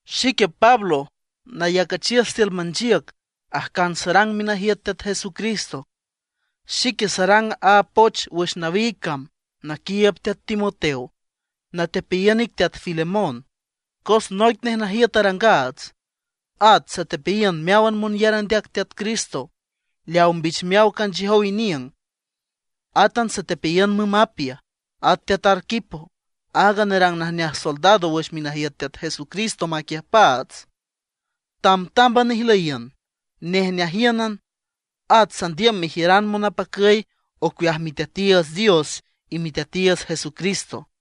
Xique Pablo, nayacüchiüs tiül manchiüc ajcan sarang minajiüt Teat Jesucristo. Xique sarang aaga poch wüx nawiig cam naquiiüb teat Timoteo, natepeayiün ic teat Filemón, cos noic nej najiüt arangaats. At satepeayiün meáwan monyar andeac Teat Cristo leaw mbichmeaw canchiüjow iniüng. Átan satepeayiün müm Apia. At teat Arquipo, áag nerang najneaj soldado wüx minajiüt Teat Jesucristo maquiüjpaats. Tambtámban ijlüyiün, nejneajíünan, at sandiüm mejiüran monapacüy ocueaj Miteatiiüts Dios y Miteatiiüts Jesucristo.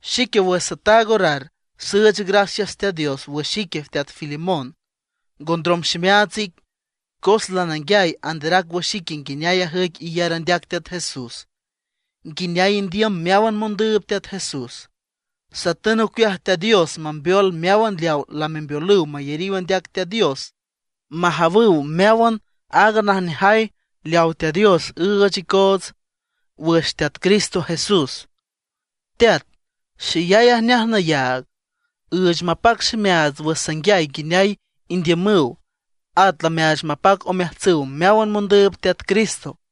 Xique wüx sataag orar süüch gracias Teat Dios wüx ique teat Filemón, ngondrom ximeaats ic. Cos lananguiay anderac wüx ique nguineay ajüic iyar andeac Teat Jesús, nguineay indiüm meáwan mondüüb Teat Jesús. Satün ocueaj Teat Dios mambeol meáwan leaw lamembeolüw mayariw andeac Teat Dios, majawüw meáwan aaga najneajay leaw Teat Dios üüch icoots wüx Teat Cristo Jesús. Teat, xeyay ajneaj nayaag, üüch mapac ximeaats wüx sanguiay nguineay indiümüw, at lameaach mapac omeajtsüw meáwan mondüüb Teat Cristo.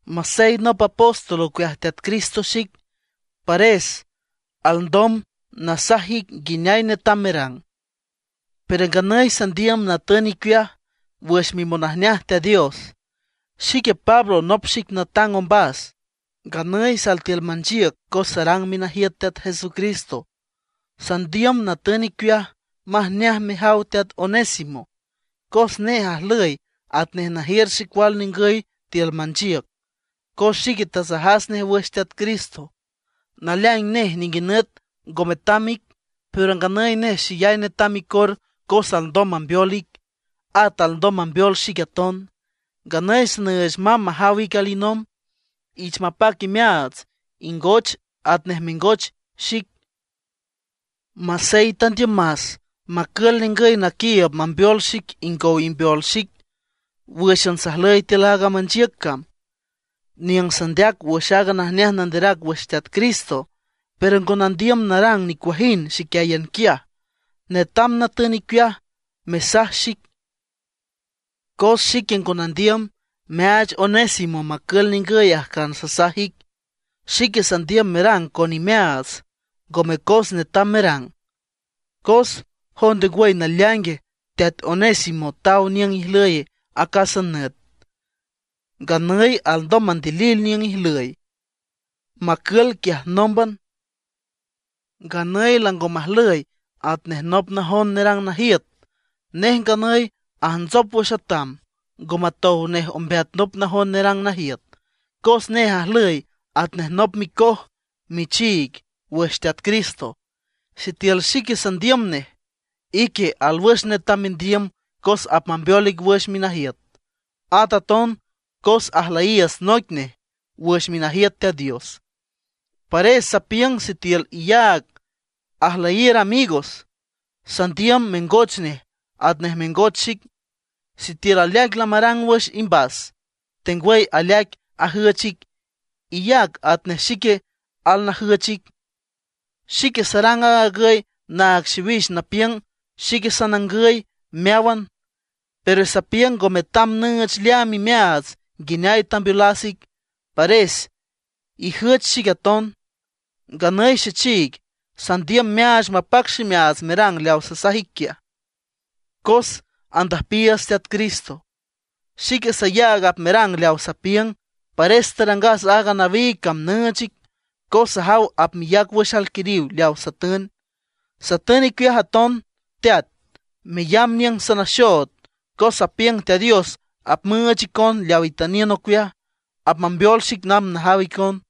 Masey nop apóstol ocueaj Teat Cristo xic, pares alndom nasaj ic nguineay netam merang, pero nganüy sandiüm natün icueaj wüx mimonajneaj Teat Dios. Xique Pablo nop xic natang ombas, nganüy sal tiül manchiüc cos sarang minajiüt Teat Jesucristo. Sandiüm natün icueaj majneaj mejaw teat Onésimo, cos nej ajlüy atnej najiür xecual ningüy tiül manchiüc, cos xique tasajas nej wüx Teat Cristo. Naleaing nej ninguinüt ngo metam ic; pero nganüy nej xeyay netam icor cos alndom mambeol ic, at alndom mambeol xic aton. Nganüy sanüüch mamb majaw ic alinomb. Ich mapac imeaats, ingoch atnej mengoch xic. Masey tandiümas macül ningüy naquiiüb mambeol xic ingow imbeol xic wǘxan sajlüy tiül aaga manchiüc cam, niüng sandeac wüx aaga najneaj nanderac wüx Teat Cristo. Pero ngo nandiüm narang nicuajind xiquiáyan quiaj; netam natün icueaj mesaj xic. Cos xique ngo nandiüm meaach Onésimo macül ningüy ajcan sasaj ic; xique sandiüm merang con imeaats, ngome cos netam merang. Cos, ¿jonde ngwüy naleaingue? teat Onésimo taw niüng ijlüy acásan nüt, nganüy alndom mandilil niüng ijlüy macül quiaj nómban. Nganüy lango majlüy atnej nop najon nerang najiüt, nej nganüy ajntsop wüx atam, ngo matow nej ambeat nop najon nerang najiüt, cos nej ajlüy atnej nop micoj michiig wüx Teat Cristo. Sitiül xique sandiüm nej, ique alwüx netam mendiüm cos apmambeol ic wüx minajiüt, at aton cos ajlüyiiüts noic nej wüx minajiüt Teat Dios. Pares sapiüng sitiül iyaag ajlüyiür amigos, sandiüm mengoch nej atnej mengoch xic. Sitiül aleaic lamarang wüx imbas, tengwüy aleaic ajüch ic, iyac atnej xique alnajüch ic. Xique sarang aag agüy naag xiwix napiüng xic sanangüy meáwan. Pero sapiüng ngo metam nüüch leaam imeaats nguineay tambeolas ic, pares ijüch xic aton. Nganüy xechiig, sandiüm meaach mapac ximeaats merang leaw sasaj ic quiaj, cos andüjpiiüts Teat Cristo. Xique sayaag apmerang leawa sapiüng, pares tarangas aaga nawiig cam nüüch ic, cos sajaw apmeyac wüx alquiriw leawa satün. Satün icueaj aton teat, meyamb niüng sanaxood, cos sapiüng Teat Dios apmüüch icon leaw itüniün ocueaj, apmambeol xic namb najaw icon.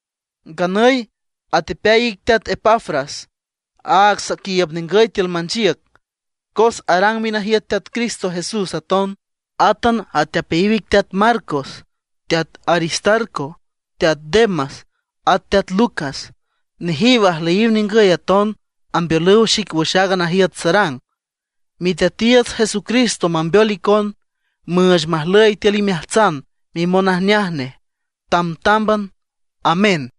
Nganüy atepeay ic teat Epafras, áag saquiiüb ningüy tiül manchiüc, cos arang minajiüt Teat Cristo Jesús aton. Átan atepeayiw ic teat Marcos, teat Aristarco, teat Demas, at teat Lucas. Nejiw ajlüyiw ningüy aton, ambeolüw xic wüx aaga najiüt sarang. Miteatiiüts Jesucristo mambeol icon, müüch majlüy tiül imeajtsan mimonajneaj nej, tambtámban. Amén.